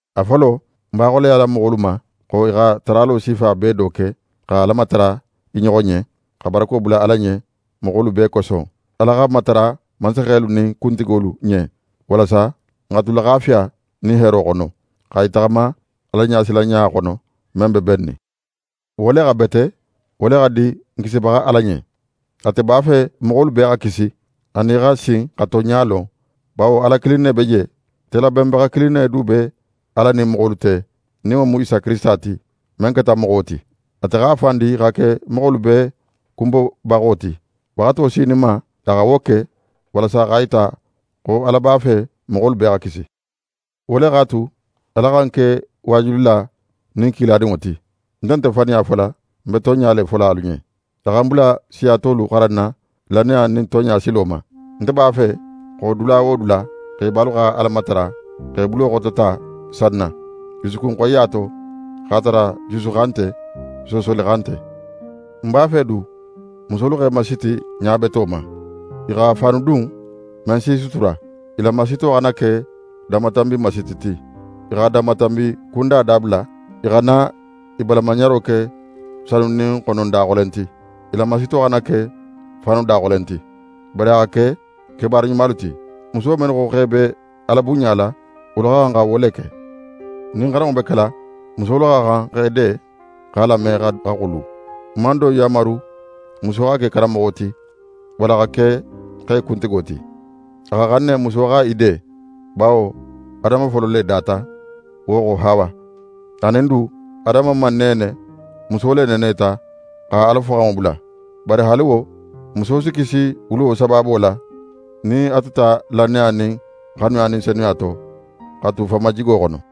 A folo, ń b'a xoleyala moxolu ma, xo i xa taralo sifa bee do ke, xa Ala matara i ɲoxo ɲen, xa barako bula Ala ɲen moxolu bee koso. Ala xa matara mansaxelu nin kuntigolu ɲen walasa n xa tu laxafiya nin heero xono, xa i taxama Alaɲasilanɲa xono, men be bennin. Wo le xa bete, wo le xa di n Kisibaxa Ala ɲen. Ate b'a fe moxolu bee xa kisi, anin i xa sin xa tonɲa lon. Bawo Ala kilin ne be je. Telabenbaxa kilin ne du be Ala nin moxolu te, nin wo mu Isa Kirisita ti, men keta moxo ti. Ate x'a fan di xa ke moxolu bee kunbobaxo ti. Waxato sininma, a xa wo ke; walasa x'a yita xo Ala b'a fe moxolu bee xa kisi. Wo le x'a tu, Ala xa ń ke waajulila nin kiladinŋo ti. Ń nte faniya fola, ń be tonɲa le fola alu ɲen. A xa ń bula siya tolu xaranna lannaya nin tonɲa silo ma. Nte b'a fe xo, dula wo dula, xebalu xa Ala matara, x'e bulo xotota sanna, jusukun xoyiya to, x'a tara jusu xan nte, soosoli xan nte. Ń b'a fe du, musolu x'e masiti ɲa beto ma. I xa faanu dun, men s'i sutura. I la masito xana ke danmatanbi masiti ti. I xa danmatanbi kunda dabula. I xana i balamaɲaro ke sanu nin xonon daxolen ti. I la masito xana ke faanu daxolen ti. Bari a xa ke kebaara ɲumalu ti. Muso mennu xo x'e be Ala bunɲala, wolu xa xan xa wo le ke. Nin xaranŋo be kela, musolu xa xan xa i de, x'a lame xa xulu. Ń man don yanmaru muso xa ke karanmoxo ti, walla xa ke xe kuntigo ti. A xa xan ne muso xa í de. Bawo Adama folo le data; wo xo, Hawa. Anin du, Adama man neene; muso le neeneta, xa Ala foxanŋo bula. Bari haali wo, muso si kisi wuluwo sabaabo la, nin a tuta lannaya nin xanuya nin senuya to, xa tu fanmajigo xono.